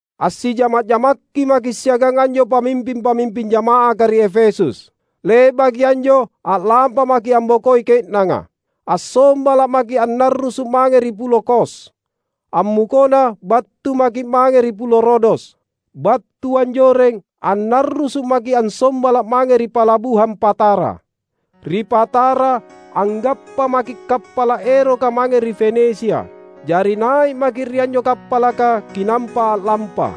Assijama’-jamakki maki’ siagang anjo pamimping-pamimping jama’aka ri Efesus. Le’baki anjo a’lampa maki’ ambokoi ke’nanga. Assombala’ maki’ annarrusu’ mange ri pulo Kos; ammukona battu maki’ mange ri pulo Rodos. Battu anjoreng annarrusu’ maki’ assombala’ mange ri palabuhang Patara. Ri Patara, anggappa maki’ kappala’ eroka mange ri Fenisia. Jari nai’ maki’ ri anjo kappalaka kinampa a’lampa.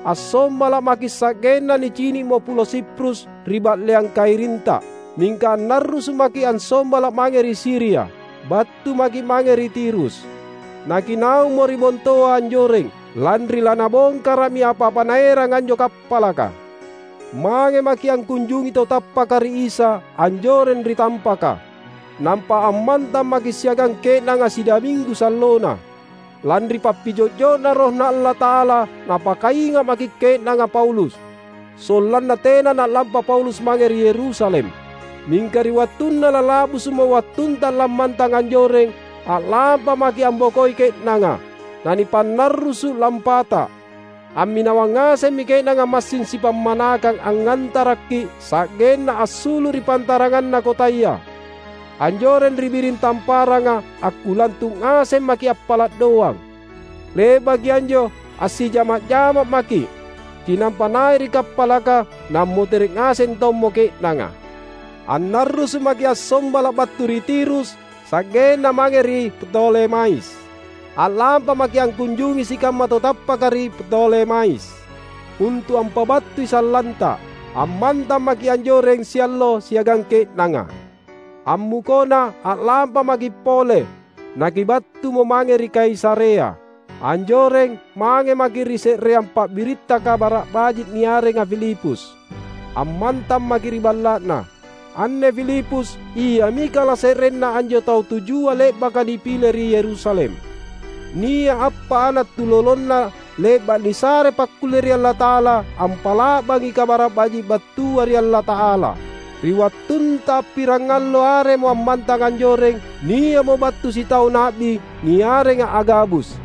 Assombala’ maki sa’genna nicini’mo pulo Siprus ri ba’leang kairinta; mingka annarrusu’ maki’ assombala’ mange ri Siria. Battu maki’ mange ri Tirus. Nakinaummo ri bontoa anjoreng, lanri lanabongkara’mi apa-apa naeranga anjo kappalaka. Mange maki’ angkunjungi tau tappaka ri Isa anjoreng ri tampaka, nampa ammantang maki’ siagang ke’nanga sidaminggu sallona. Lanri pappijo’jo’Na RohNa Allata’ala napakainga’mi ke’nanga Paulus, sollanna tena na’lampa Paulus mange ri Yerusalem. Mingka ri wattunna lala’busu’mo wattunta lammantang anjoreng, a’lampa maki’ ambokoi ke’nanga, nanipannarrusu’ lampata. Amminawang ngasemmi ke’nanga massing sipammanakang angngantarakki’ sa’genna assulu’ ri pantaranganna kotaya. Anjoreng ri biring tamparanga, akkulantu’ ngaseng maki’ appala’ doang. Le’baki anjo assijama’-jamakki maki’, kinampa nai’ ri kappalaka; nammotere’ ngaseng tommo ke’nanga. Annarrusu’ maki’ assombala’ battu ri Tirus sa’genna mange ri Ptolemais. A’lampa maki’ angkunjungi sikamma tau tappaka ri Ptolemais, untu’ ampabattui sallanta. Ammantang maki’ anjoreng siallo siagang ke’nanga. Ammukona a’lampa maki’ pole, nakibattumo mange ri Kaisarea. Anjoreng, mange maki’ ri se’reang pabiritta Kabara’ Baji’ niarenga Filipus. Ammantang maki’ ri balla’na. Anne Filipus, iami kalase’renna anjo tau tujua le’baka nipile ri Yerusalem. Nia’ appa’ ana’ tulolona le’ba’ nisare pakkulle ri Allata’ala ampa’la’bangi Kabara’ Baji’ battua ri Allata’ala. Ri wattunta pirangallo aremo ammantang anjoreng, nia’mo battu sitau na’bi niarenga Agabus;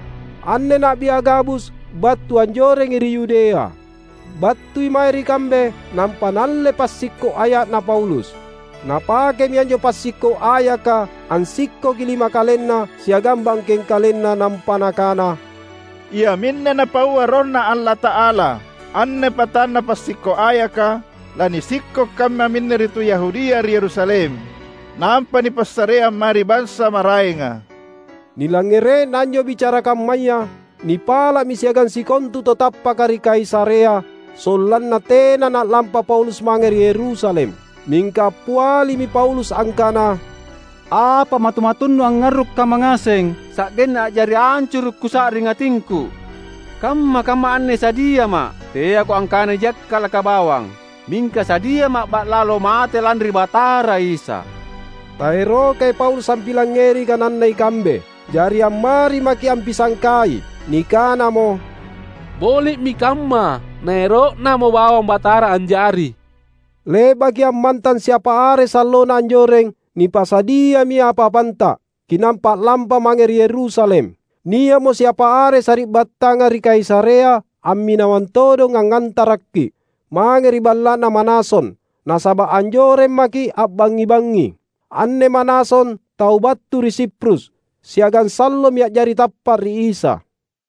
anne Na’bi Agabus battu anjorengi ri Yudea. Battui mae ri kambe nampa naalle passikko’ aya’na Paulus. Napakemi anjo passikko’ ayaka ansikkoki lima kalenna siagang bangkeng kalenna nampa nakana, "Iaminne Napaua RohNa Allata’ala: Anne patanna passikko’ ayaka lanisikko’ kammaminne ri tu Yahudia ri Yerusalem, nampa nipassareang mae ri bansa maraenga." Nilangngere’na anjo bicara kammaya, nipala’mi siagang sikontu tau tappaka ri Kaisarea, sollanna tena na’lampa Paulus mange ri Yerusalem. Mingka appialimi Paulus angkana, "Apa matu-matunnu angngarru’ kamma ngaseng, sa’genna a’jari ancuru’ kusa’ring atingku? Kamma-kamma anne sadiama’; teako angkana nijakkala’ bawang, mingka sadiama’ ba’lalo mate lanri Batara Isa." Taerokai Paulus ampilangngeri kananna ikambe, jari ammari maki’ ampisangkai Nikanamo: "Boli’mi kamma naero’Namo bawang Batara anjari." Le’bakki’ ammantang siapa are sallona anjoreng, nipasadiami apa-apanta, kinampa a’lampa mange ri Yerusalem. Nia’mo siapa are sari’battanga ri Kaisarea amminawang todong angngantarakki’, mange ri balla’na Manason, nasaba’ anjoreng maki’ a’bangngi-bangngi. (Anne Manason tau battu ri Siprus, siagang sallomi a’jari tappa’ ri Isa.)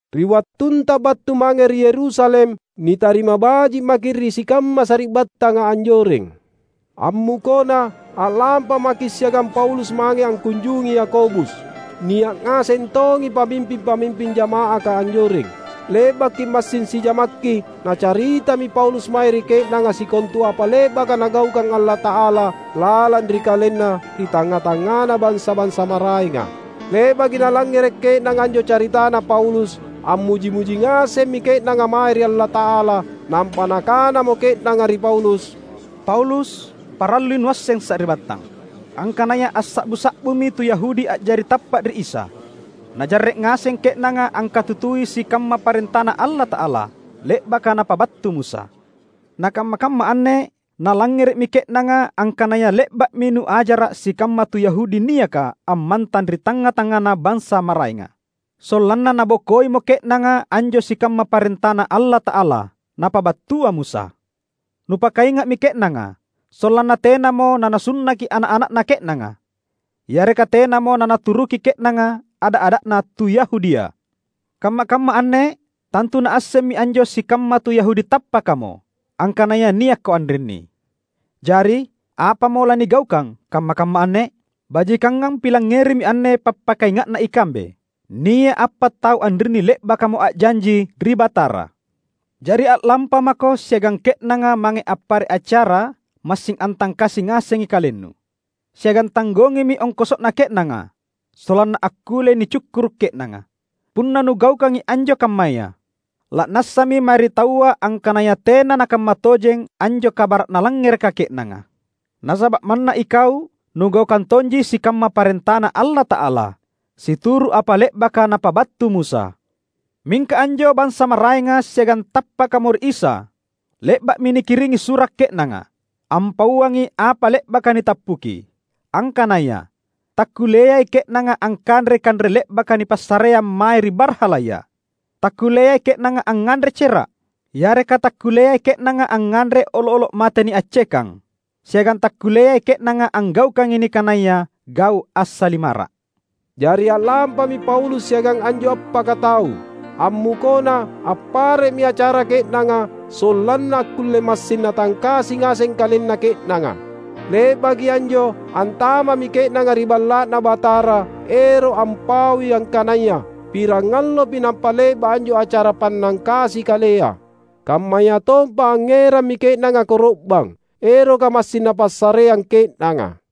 Ri wattunta battu mange ri Yerusalem, nitarima baji’ maki’ ri sikamma sari’battanga anjoreng. Ammukona, a’lampa maki’ siagang Paulus mange angkunjungi Yakobus; nia’ ngaseng tongi pamimping-pamimping jama’aka anjoreng. Le’bakki’ massing sijamakki, nacaritami Paulus mae ri ke’nanga sikontu apa le’baka Nagaukang Allata’ala lalang ri kalenna ri tangnga-tangngana bansa-bansa maraenga. Le’baki nalangngere’ ke’nanga anjo caritana Paulus, ammuji-muji ngasemmi ke’nanga mae ri Allata’ala. Nampa nakanamo ke’nanga ri Paulus, "Paulus! Parallui nuasseng sari’battang, angkanaya assa’bu-sa’bumi tu Yahudi a’jari tappa’ ri Isa. Najarre’ ngaseng ke’nanga angkatutui sikamma parentaNa Allata’ala, le’baka napabattu Musa. Na kamma-kamma anne nalangngere’mi ke’nanga angkanaya le’ba’mi nuajara’ sikamma tu Yahudi niaka ammantang ri tangnga-tangngana bansa maraenga, sollanna nabokoimo ke’nanga anjo sikamma parentaNa Allata’ala napabattua Musa. Nupakainga’mi ke’nanga sollanna tenamo nanasunnaki ana’-ana’na ke’nanga, yareka tenamo nanaturuki ke’nanga ada’-ada’na tu Yahudia. Kamma-kamma anne tantu naassemmi anjo sikamma tu Yahudi tappakamo angkanaya niakko anrinni. Jari, apamo lanigaukang kamma-kamma anne? Bajikangang pilangngerimi anne pappakainga’na ikambe. Nia’ appa’ tau anrinni le’bakamo a’janji ri Batara. Jari a’lampamako siagang ke’nanga mange appare’ acara massing antangkasi ngasengi kalennu. Siagang tanggongimi ongkoso’na ke’nanga sollanna akkulle nicukkuru’ ke’nanga. Punna nugaukangi anjo kammaya, la’nassami mae ri taua angkanaya tena nakamma tojeng anjo kabara’ nalangngereka ke’nanga; nasaba’ manna ikau nugaukang tonji sikamma parentaNa Allata’ala, situru’ apa le’baka napabattu Musa. Mingka anjo bansa maraenga siagang tappakamo ri Isa, le’ba’mi nikiringi sura’ ke’nanga, ampauangi apa le’baka nitappuki, angkanaya: takkulleai ke’nanga angkanrei kanre le’baka nipassareang mae ri barhalaya, takkulleai ke’nanga angnganre cera’, yareka takkulleai ke’nanga angnganre olo’-olo’ mate niaccekang; siagang takkulleai ke’nanga anggaukangi nikanaya gau’ assalimara’." Jari a’lampami Paulus siagang anjo appaka tau. Ammukona, appare’mi acara ke’nanga sollanna akkulle massing natangkasi ngaseng kalenna ke’nanga. Le’baki anjo antama’mi ke’nanga ri Balla’Na Batara ero’ ampaui angkanaya pirangallopi nampa le’ba’ anjo acara pannangkasi kalea. Kammayatompa angngerammi ke’nanga koro’bang, eroka massing napassareang ke’nanga.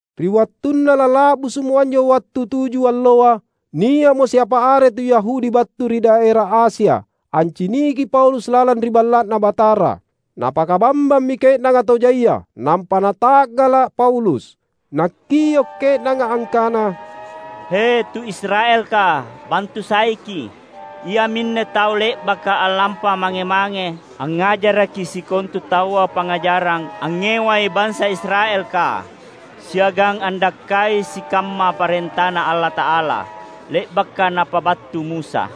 Ri wattunna lala’busu’mo anjo wattu tuju alloa, nia’mo siapa are tu Yahudi battu ri daera Asia anciniki Paulus lalang ri Balla’Na Batara. Napakabambammi ke’nanga tau jaia, nampa nata’gala’ Paulus. Nakkio’ ke’nanga angkana, "He, tu Israelka, bantu saiki’! Iaminne tau le’baka a’lampa mange-mange angngajaraki sikontu taua pangngajarang angngewai bansa Israelka, siagang andakkai sikamma parentaNa Allata’ala, le’baka napabattu Musa;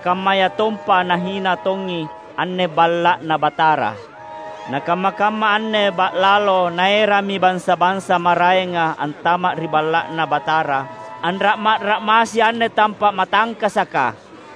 kammayatompa nahina tongi anne Balla’Na Batara. Na kamma-kamma anne ba’lalo naerammi bansa-bansa maraenga antama’ ri Balla’Na Batara, anra’ma’-ra’massi anne tampa’ matangkasaka!"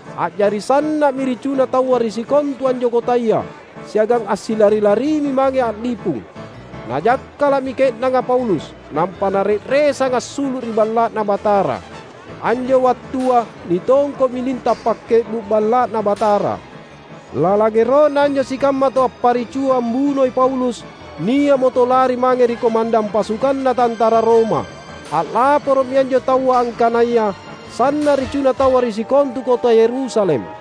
A’jari sanna’mi ricuna taua ri sikontu anjo kotaya, siagang assilari-larimi mange a’lipung. Najakkala’mi ke’nanga Paulus, nampa nare’resang assulu’ ri Balla’Na Batara. Anjo wattua nitongko’mi linta’ pakke’bu’ Balla’Na Batara. Lalang ero’na anjo sikamma tau apparicua ambunoi Paulus, nia’mo tau lari mange ri komandang pasukanna tantara Roma. A’laporo’mi anjo taua angkanaya sanna’ ricuna taua ri sikontu kota Yerusalem.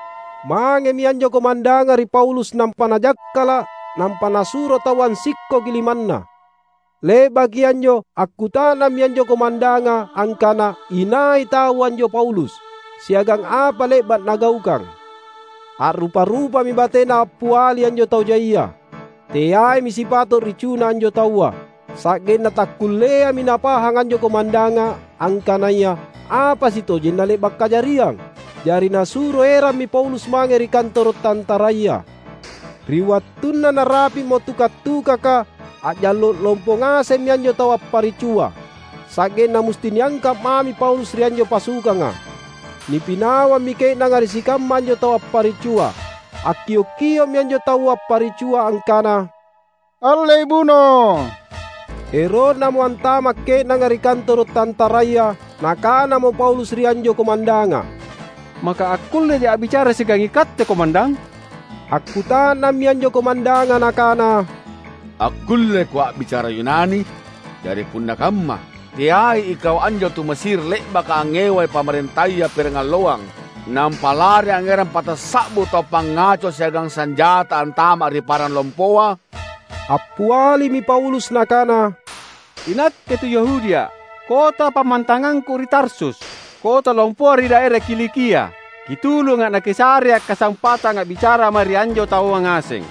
Mangemi anjo komandanga ri Paulus nampa najakkala’, nampa nasuro taua ansikkoki limanna. Le’baki anjo akkuta’nammi anjo komandanga angkana inai tau anjo Paulus, siagang apa le’ba’ nagaukang. A’rupa-rupami batena appiali anjo tau jaia. Teaimi sipato’ ricuna anjo taua. Sa’genna takkulleami napahang anjo komandanga angkanaya apa sitojenna le’ba’ kajariang. Jari nasuro erammi Paulus mange ri kantoro’ tantaraya. Ri wattunna narapi’mo tuka’-tukaka, a’jallo’ lompo ngasemmi anjo tau apparicua. Sa’genna musti niangka’ mami Paulus ri anjo pasukanga. Nipinawammi ke’nanga ri sikamma anjo tau apparicua. Akkiok-kio’mi anjo tau apparicua angkana, "Allei buno!" Ero’namo antama’ ke’nanga ri kantoro’ tantaraya, nakanamo Paulus ri anjo komandanga, "Maka akkulleja’ a’bicara siagang ikatte komandang?" Akkuta’nammi anjo komandanga nakana, "Akkulleko a’bicara Yunani? Jari punna kamma, teai ikau anjo tu Mesir le’baka angngewai pamarentaya pirangalloang nampa lari angngerang patassa’bu tau pangaco siagang sanjata antama’ ri parang lompoa?" Appialimi Paulus nakana, "Inakke tu Yahudia’; kota pammantangangku ri Tarsus, kota lompoa ri daera Kilikia. Kitulunga’ nakisarea’ kasampatang a’bicara mae ri anjo taua ngaseng."